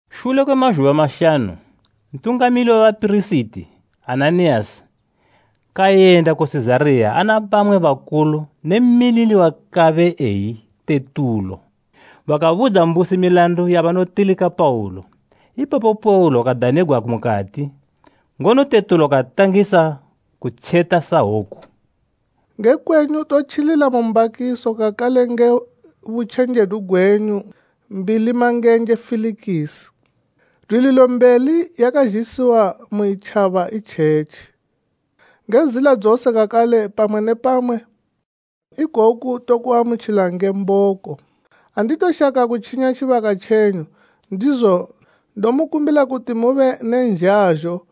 Shule kwe mazhuba mashanu Ntungamili we bapirisiti Ananiyasi kayenda ku Sizariya ana bamwe bakulu ne mmilili wakabe eyi Tetulo. Bakabudza mbusi milandu yabanotilika Paulo. Ipapo Paulo kadanigwa mukati, ngono Tetulo katangisa kubika sahwoku: “Nge kwenyu totjilila mu mbakiso kakale nge butjenjedu gwenyu mbilimangenje Felikisi, dwililo mbeli yakazhisiwa mu itjaba itjetji. Nge zila dzose kakale pamwe ne pamwe, ikoku tokuamutjila nge mboko. Anditoshaka kutjinya tjibaka tjenyu, ndizo ndomukumbila kuti mube ne nzhazho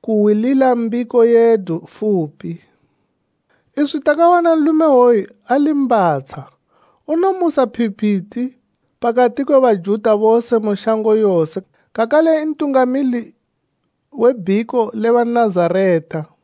kuhwilila mbiko yedu fupi. Iswi takawana nlume iwoyu ali mbatsha; unomusa phipiti pakati kwe Bajuta bose mu shango yose kakale ntungamili we bhiko le Banazareta.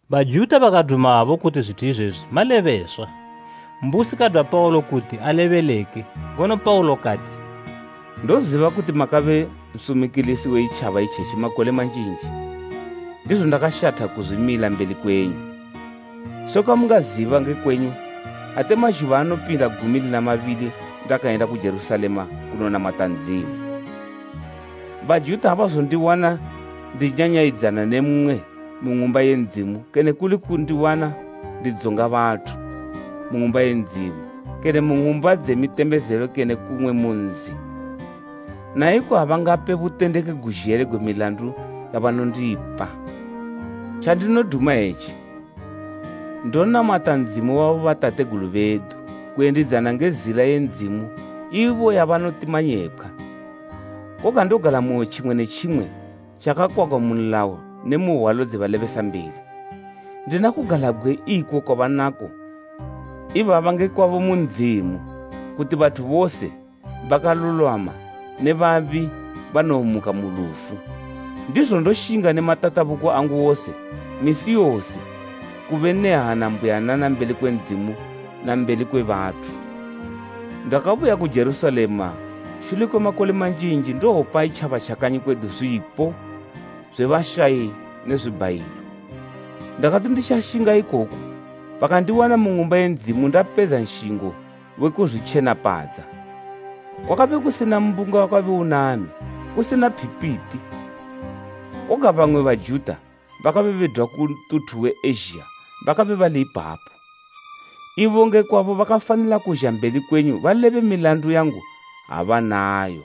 Bajuta bakadumabo kuti zwithu izwezo malebeswa. Mbusi kadwa Paulo kuti alebeleke, ngono Paulo kati: “Ndoziba kuti makabe nsumikilisi we itjaba itjetji makole manjinji, ndizo ndakashatha kuzwimila mbeli kwenyu. Sekwa mungaziba nge kwenyu, ate mazhuba anopinda gumi lina mabili ndakayenda ku Jerusalema kunonamata Ndzimu. Bajuta abazondiwana ndinyanyayidzana ne mmwe mu Ng'umba ye Ndzimu kene kuli kundiwana ndidzonga bathu, mu Ng'umba ye Ndzimu kene mu ng'umba dze mitembezelo kene kumwe nzi. Na iko abangape butendeki guzhele gwe milandu yabanondipa. Tjandinoduma etji: Ndonamata Ndzimu wa bobatategulu bedu kuyendidzana nge Zila ye Ndzimu ibo yabanoti manyepkhwa. Koga ndogalamoyo tjimwe ne tjimwe tjakakwagwa mu nlayo ne mu hwalo dze balebesambeli. Ndina kugalabgwe iko kwabanako ibaba nge kwabo mu Ndzimu, kuti bathu bose, bakalulwama ne babi banowomuka mu lufu. Ndizo ndoshinga ne matatabuko angu wose misi yose kube ne hana mbuyanana mbeli kwe Ndzimu na mbeli kwe bathu. “Ndakabuya ku Jerusalema shule kwe makole manjinji ndowopa itjaba tja kanyi kwedu zwipo zwe bashayi ne zwibhayilo. Ndakati nditjashinga ikoku bakandiwana mu Ng'umba ye Ndzimu ndapedza nshingo we kuzwitjenapadza. Kwakabe kusina mbunga wakabe unami, kusina phipiti. Koga bamwe Bajuta bakabe bedwa ku ntuthu we Ezhiya bakabe bali ipapo; ibo nge kwabo bakafanila kuzha mbeli kwenyu balebe milandu yangu ha banayo.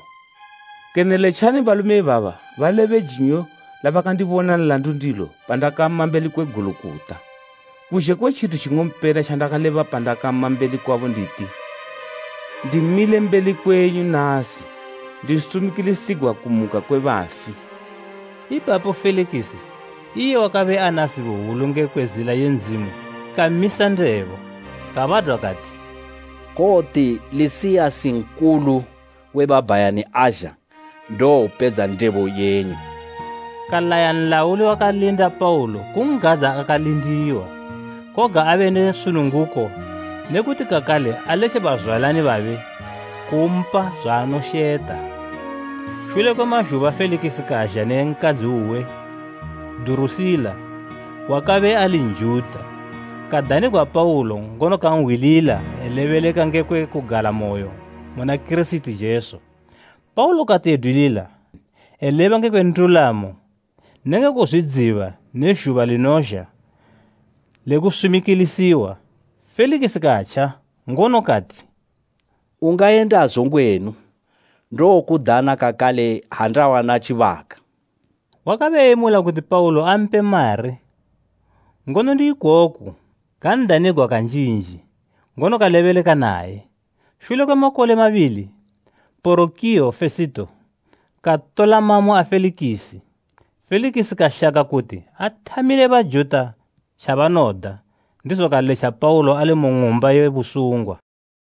Kene letja balume ibaba balebe jinyo labakandibona nlandu ndilo pandakama mbeli kwe Gulukota, kuzhe kwe tjithu tjing'ompela tjandakaleba pandakama mbeli kwabo nditi, ‘Ndimile mbeli kwenyu nasi ndisumikilisigwa kumuka kwe bafi.’” Ipapo Felikisi, iye wakabe ana zibo hwulu ngekwe Zila ye Ndzimu kamisa ndebo. Kabadwa kati, “Kowoti Lisiyasi Nkulu we babhayani azha ndowopedza ndebo yenyu.” Kalaya nlauli wakalinda Paulo kun'gadza akalindiwa, koga abe ne sununguko ne kuti kakale aletje bazwalani babe kumpa zwaanosheta. Shule kwe mazhuba Felikisi kazha ne nkadzi uwe Durusila, wakabe ali Njuta. Kadanigwa Paulo ngono kanhwilila elebeleka ngekwe kugalamoyo muna Kirisiti Jesu. Paulo kati edwilila eleba ngekwe ndulamo nenge kuzwidziba ne zhuba linozha le kusumikilisiwa, Felikisi katja ngono kati, “Ungayendazo ngwenu. Ndowokudana kakale ha ndawana tjibaka.” Wakabe eyemula kuti Paulo ampe mari; ngono ndi ikoku kan'danigwa kanjinji, ngono kalebeleka naye. Shule kwe makole mabili, Porokiyo Fesito katola mamo a Felikisi. Felikisi kashaka kuti athamile Bajuta tjabanoda ndizo kaletja Paulo ali mu ng'umba ye busungwa.